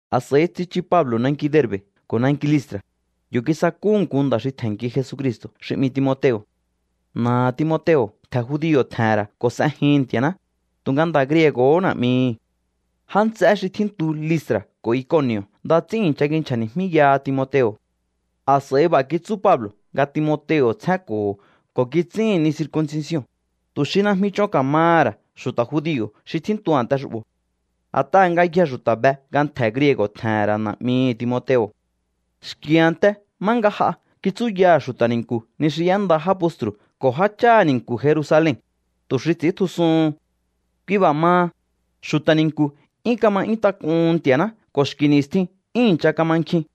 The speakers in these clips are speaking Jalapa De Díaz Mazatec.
A̱s'a̱i tsichu Pablo̱ nanki Derbe̱ ko̱ nanki Listra̱. Yo̱ kisakúhu̱ nku nda̱ xi tje̱nnki Jesucristo̱ xi 'mi Timoteo̱. Na̱aha̱ Timoteo̱ ntje̱ judio̱ tje̱he̱n ra̱ ko̱ s'ejihi̱n Nti̱a̱ná, tu̱nga nda̱ griego̱hó na̱'mihi̱. Já nts'eé xi tjíntu Listra̱ ko̱ Iconi̱o̱ nda ts'ín i̱ncha kinchja̱ni̱jmíyaha Timoteo̱. A̱s'a̱i b'a̱ kitsú Pablo̱ nga Timoteo̱ tsjénko̱ho̱ ko̱ kits'íhi̱n ni circuncision, tu̱ xi najmi ch'on ka̱maha̱ ra̱ xu̱ta̱ judio̱ xi tjíntu a̱nte xu'bo̱. A̱t'aha̱ ngayjee̱ xu̱ta̱ be nga ntje̱ griego̱ tje̱he̱n ra̱ na̱'mihi̱ Timoteo̱. Xki̱ a̱nte má nga j'a kitsúyaha̱ xu̱ta̱ ni̱nku̱ ni xi y'énda já postru̱ ko̱ jácháha̱ ni̱nku̱ Jerusalen, tu̱ xi ts'i̱íntjusuhun. Kui b'a̱ maha, xu̱ta̱ ni̱nku̱ 'yún kama 'yún tak'uhun Nti̱a̱ná ko̱ xki̱ ni̱stjin 'yún i̱ncha kama nkjin.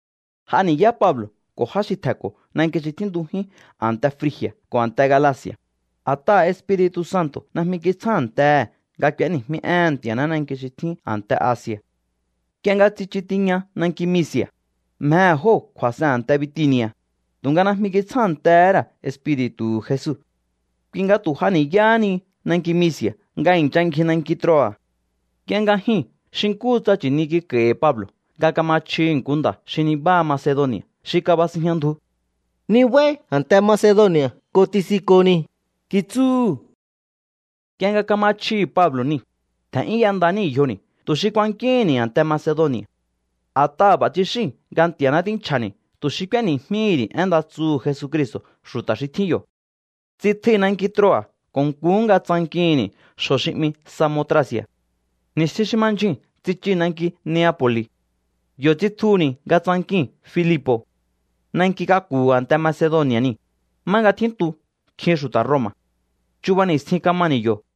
J'a ni̱yá Pablo̱ ko̱ já xi tje̱nko̱ nanki xi tjíntujín a̱nte Frigi̱a̱ ko̱ a̱nte Galaci̱a̱, a̱t'aha̱ Espiri̱tu̱ Santo̱ najmi kitsjántehe̱ nga k'u̱éni̱jmí éhe̱n Nti̱a̱ná nanki xi tjín a̱nte Asi̱a̱. Nk'ie nga tsichu tiña nanki Misi̱a̱, mjehe̱ jóo̱ kju̱a̱s'en a̱nte Bitini̱a̱, tu̱nga najmi kitsjántehé ra̱ Espiri̱tu̱hu̱ Jesu. Kui nga tu̱ j'a ni̱yáhá ni nanki Misi̱a̱ nga i̱ncha ngji nanki Troa̱. Nk'ie nga jyuu̱n xi nkúhu tsa nchi̱ni kik'a̱i̱hi̱ Pablo̱ nga kama chjihi̱ nku nda̱ xi nibáha Macedoni̱a̱ xi kabasinjña ndju. “Nibáí a̱nte Macedoni̱a̱ ko̱ ti̱si̱nko̱ni̱”, kitsúhu̱. Nk'ie nga kama chjihi̱ Pablo̱ niu̱, tje̱n'yún y'enda níi̱ yjoni̱ tu̱ xi kuankíhi̱nni̱ a̱nte Macedoni̱a̱. A̱t'aha̱ b'a̱ tsixíi̱n nga Nti̱a̱ná tínchja̱ni̱ tu̱ xi k'úéni̱jmíhi̱ ri̱ én nda tsuhu̱ Jesucristo̱ xu̱ta̱ xi tjín yo̱. Tsitjui̱ nanki Troa̱ ko̱ nkuhú nga tsankihi̱nni̱ xjo̱ xi 'mi Samotraci̱a̱. Ni̱stjin xi ma ndyjuu̱n tsichii̱ nanki Neapo̱li̱. Yo̱ tsitjuhu̱ni̱ nga tsankii̱n Filipo̱. Nanki k'aku̱hu̱ a̱nte Macedoni̱a̱ niu̱, má nga tjíntu nkjin xu̱ta̱ Roma̱. Chuba ni̱stjin kamani̱ yo̱.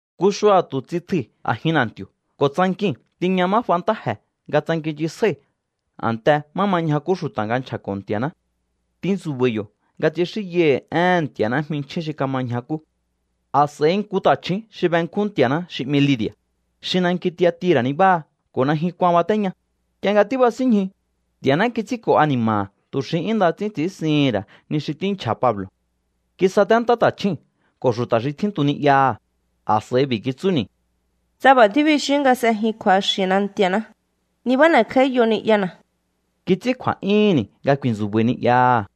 Nku xua̱tu̱ tsitjui̱ a̱jin na̱nti̱o̱ ko̱ tsankii̱n tiña má f'a ntáje̱ nga tsankinnchisjái̱ a̱nte má ma ñjakú xu̱ta̱ nga nchja̱ko̱ Nti̱a̱ná. Tintsu̱ba̱i̱ yo̱ nga tsixínyai̱hi̱ éhe̱n Nti̱a̱ná jminchjín xi kama ñjakú. A̱s'a̱i nku ta̱chju̱ún xi benkjún Nti̱a̱ná xi 'mi Lidi̱a̱, xi nanki Tiatira̱ nibáha ko̱ najyun kuan batéña, nk'ie nga tíbasínñju, Nti̱a̱ná kits'ínko̱ ani̱ma̱ha̱ tu̱ xi 'yún nda ts'ín ts'i̱ínsihi̱n ra̱ ni xi tínchja̱ Pablo̱. Kisatentá ta̱chjúu̱n ko̱ xu̱ta̱ xi tjíntu ni'yaha̱. A̱s'a̱i b'i̱ kitsúni̱: —Tsa b'a̱ tíbixíún nga s'ejin kju̱axi̱na Nti̱a̱ná, nibá n'e̱kj'áíyo ni'yana̱. Kits'ín kju̱a̱'yúhu̱nni̱ nga ku̱i̱ntsu̱ba̱i̱ ni'yaha̱.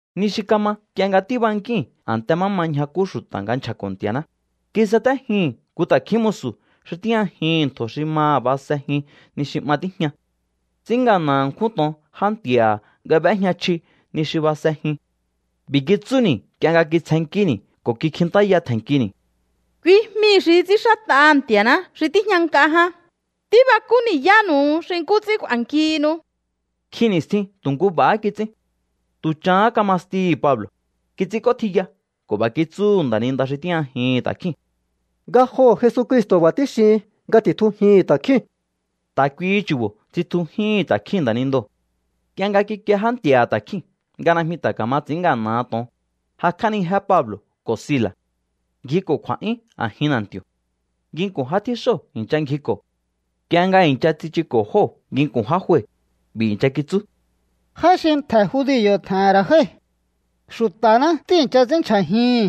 Ni xi kama nk'ie nga tíbankíi̱n a̱nte má ma ñjakú xu̱ta̱ nga nchja̱ko̱ Nti̱a̱ná, kisatéjii̱n nku ta̱kjín musu̱ xi tíjñajihi̱n ntjo̱ xi maha̱ basejin ni xi 'ma tíjña. Ts'ín ngana̱ ṉkjún to̱on já nti̱a̱ha̱ nga b'éjña chji ni xi basejin. B'i̱ kitsúni̱ nk'ie nga kitsjennkíni̱ ko̱ kikjintáya tje̱nnkini̱: —Kui jmii̱ xi ts'ínxát'aha̱ Nti̱a̱ná xi tíjña nk'a ján. Tíbakú ni̱yánu̱u xi nkú ts'ín k'u̱a̱nkihinu. Nkjin ni̱stjin tu̱ nku b'a̱há kits'ín. Tu̱ chahán kama stihi̱ Pablo̱, kits'ínk'ótjiya ko̱ b'a̱ kitsúhu̱ nda̱ninda xi tíjñajihi̱n ta̱kjíu̱n: —Ngajoho̱ Jesucristo̱ b'a̱ tíxihin nga ti̱tjujihi̱n ta̱kjíu̱n. Ta̱ kuihi chu̱bo̱ tsitjujíhi̱n ta̱kjíu̱n nda̱nindoo̱. Nk'ie nga kikie já nti̱a̱ha̱ ta̱kjíu̱n nga najmi ta̱ ka̱ma ts'i̱ín ngana̱ha to̱on, jakj'ánijé Pablo̱ ko̱ Sila̱. Ngjiko̱ kju̱a̱'yún a̱jin na̱nti̱o̱. Nginku̱n já tjíxóo̱ i̱ncha ngjiko̱. Nk'ie nga i̱ncha tsichuko̱ jóo̱ nginku̱n já jue, b'i̱ i̱ncha kitsú: —Já xi ntje̱ judio̱ tje̱he̱n ra̱ jái̱. Xu̱ta̱ná tíi̱ncha ts'ínndyjajihi̱n.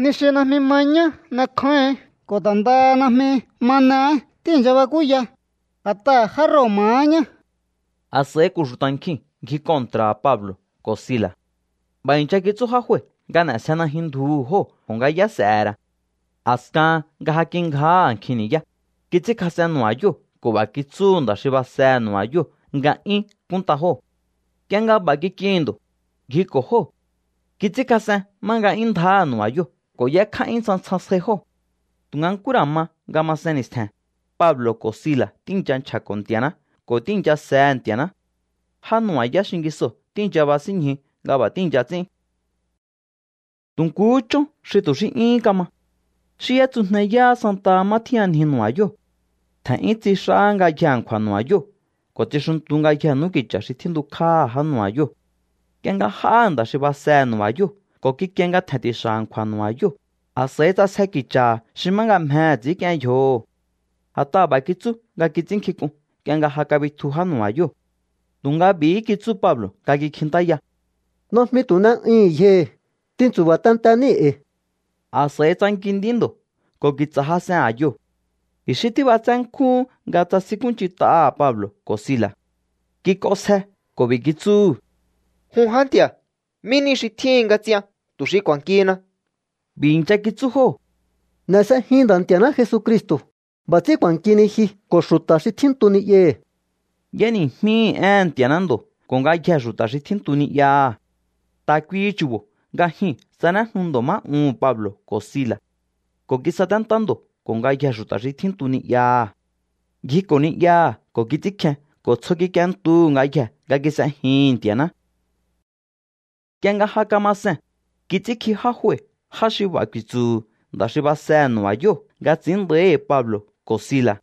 Ni xi najmi ma ñá n'ekjáíhi̱ín ko̱ ta̱ ndaha najmi ma n'eé tíi̱ncha bakúya, a̱t'aha̱ já Roma̱há ñá. A̱s'a̱i ko̱ xu̱ta̱ nkjiu̱n ngji kontra̱ha̱ Pablo̱ ko̱ Sila̱. B'a̱ i̱ncha kitsú já jue nga n'e̱sje najyun ndjuhu̱ jóo̱ ko̱ nga yá s'e̱he̱ ra̱. A̱skahan nga ja kingjáha̱ nkjin ni̱yá, kits'ínkjas'en nu̱ba̱yóo̱ ko̱ b'a̱ kitsúhu̱ nda̱ xi basehe̱ nu̱ba̱yóo̱ nga 'yún kúnnta jóo̱. Nk'ie nga b'a̱ kik'ihi̱n ndo̱, ngjiko̱ jóo̱. Kits'ínkjas'en má nga 'yún ndjáha̱ nu̱ba̱yóo̱ ko̱ y'ékj'á'yún tsjantsjan sjai jóo̱. Tu̱nga nkú ra̱ ma nga masen ni̱stje̱n, Pablo̱ ko̱ Sila̱ tíi̱ncha nchja̱ko̱ Nti̱a̱ná ko̱ tíi̱ncha sehe̱ Nti̱a̱ná. Já nu̱ba̱yá xingisoo̱ tíi̱ncha basínñju nga b'a̱ tíi̱ncha ts'ín. Tu̱ nkuhú chón xi tu̱ xí 'yúhún kama. Xí y'étsujneyáha santaha má tjíyanji nu̱ba̱yóo̱. Tje̱n'yún tsix'ahá ngayjee̱ a̱nkju̱a̱ nu̱ba̱yóo̱ ko̱ tsixuntu ngayjee̱ n'úki̱cha̱ xi tjíntukj'áha̱ já nu̱ba̱yóo̱. Nk'ie nga j'áha̱ nda̱ xi basehe̱ nu̱ba̱yóo̱ ko̱ kikie nga tje̱n ti̱xa̱ a̱nkju̱a̱ nu̱ba̱yóo̱, a̱s'a̱i ts'asje ki̱cha̱ha̱ xi má nga mjehe̱ ts'i̱ínk'ien yjoho̱. A̱t'aha̱ b'a̱ kitsú nga kits'ínnkjink'un nk'ie nga ja kabitju já nu̱ba̱yóo̱. Tu̱nga b'i̱hí kitsú Pablo̱ nga kikjintáya: —Najmi tu̱ n'e'uihi̱n yjohi̱. Tintsu̱ba̱ tente níi̱ e̱i̱. A̱s'a̱i tsanki nd'í ndo̱ ko̱ ki̱tsa̱ jas'en a̱yoo̱. I̱xí tíb'atsé nkjúhún nga tsasinkúnch'int'aha̱ Pablo̱ ko̱ Sila̱. Kik'onsje ko̱ b'i̱ kitsúhu̱: —Jun já nti̱a̱, ¿mí ni xi tjíhin nga ts'ian tu̱ xi k'u̱a̱nkihina? B'i̱ i̱ncha kitsú jóo̱: —N'e̱ s'ejin Nda̱ Nti̱a̱ná Jesucristo̱. B'a̱ ts'ín k'u̱a̱nkihini ji ko̱ xu̱ta̱ xi tjíntu ni'yahi̱. Y'éni̱jmíhi̱ éhe̱n Nti̱a̱ná ndo̱ ko̱ ngayjee̱ xu̱ta̱ xi tjíntu ni'yaha̱. Ta̱ kuihi chu̱bo̱ nga jyuu̱n tsanéjnu ndo̱ má uhu̱n Pablo̱ ko̱ Sila̱. Ko̱ kisaténtá ndo̱ ko̱ ngayjee̱ xu̱ta̱ xi tjíntu ni'yaha̱. Ngjiko̱ ni'yaha̱ ko̱ kits'ínkjen ko̱ tsjo kik'ientuhu̱ ngayjee̱ nga kis'ejihi̱n Nti̱a̱ná. Nk'ie nga ja kama see̱n, kits'ínkji já jue já xi b'a̱ ku̱i̱tsu̱hu̱ nda̱ xi basehe̱ nu̱ba̱yóo̱ nga ts'i̱ín nda̱íhi̱ Pablo̱ ko̱ Sila̱.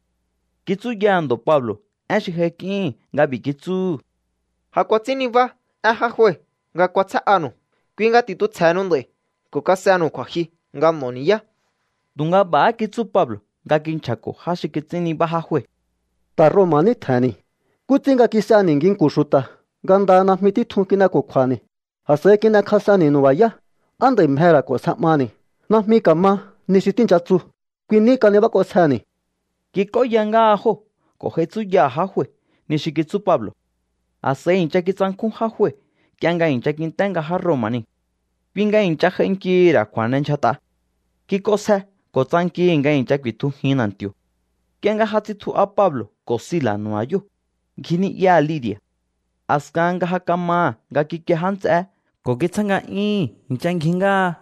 Kitsúyaha̱ ndo̱ Pablo̱ én xi j'aik'íhi̱n nga b'i̱ kitsúhu̱: —Ja kuats'ín nibá én já jue nga k'uasjé'anu̱u. Kui nga ti̱tjusje̱henu nd'a̱i̱ ko̱ kas'enu̱u kju̱a̱jyu nga n'o̱o ni̱yá. Tu̱nga b'a̱há kitsú Pablo̱ nga kinchja̱ko̱ já xi kits'ín nibá já jue: —Ta̱ Roma̱ ní tje̱he̱nni̱. ¿Nkú ts'ín nga kis'ehe̱ni̱ nginku̱n xu̱ta̱ nga ndaha najmi títjun kin'eko̱kju̱a̱ni̱, a̱s'a̱i kin'ekjas'enni̱ nu̱ba̱yá? ¿Á nd'a̱i̱ mjehe̱ ra̱ k'o̱nsje 'maha̱ni̱? ¡Najmi ka̱ma ni xi tíi̱ncha tsu! Kui ní kanibák'osjeni̱. Kik'óya ngáha jóo̱ ko̱ j'ai tsúyaha̱ já jue ni xi kitsú Pablo̱. A̱s'a̱i i̱ncha kitsankjún já jue nk'ie nga i̱ncha kint'é nga já Roma̱ niu̱. Kui nga i̱ncha j'ainkihi̱ ra̱ kju̱a̱n'endyjat'a. Kik'onsje ko̱ tsankihi̱ nga i̱ncha ku̱i̱tjujin na̱nti̱o̱. Nk'ie nga ja tsitju'a Pablo̱ ko̱ Sila̱ nu̱ba̱yóo̱, ngji ni'yaha̱ Lidi̱a̱. A̱skahan nga ja kamaha̱ nga kikie já nts'eé ko̱ kitsjáha̱ nga'yúhu̱n, i̱ncha ngji ngáha.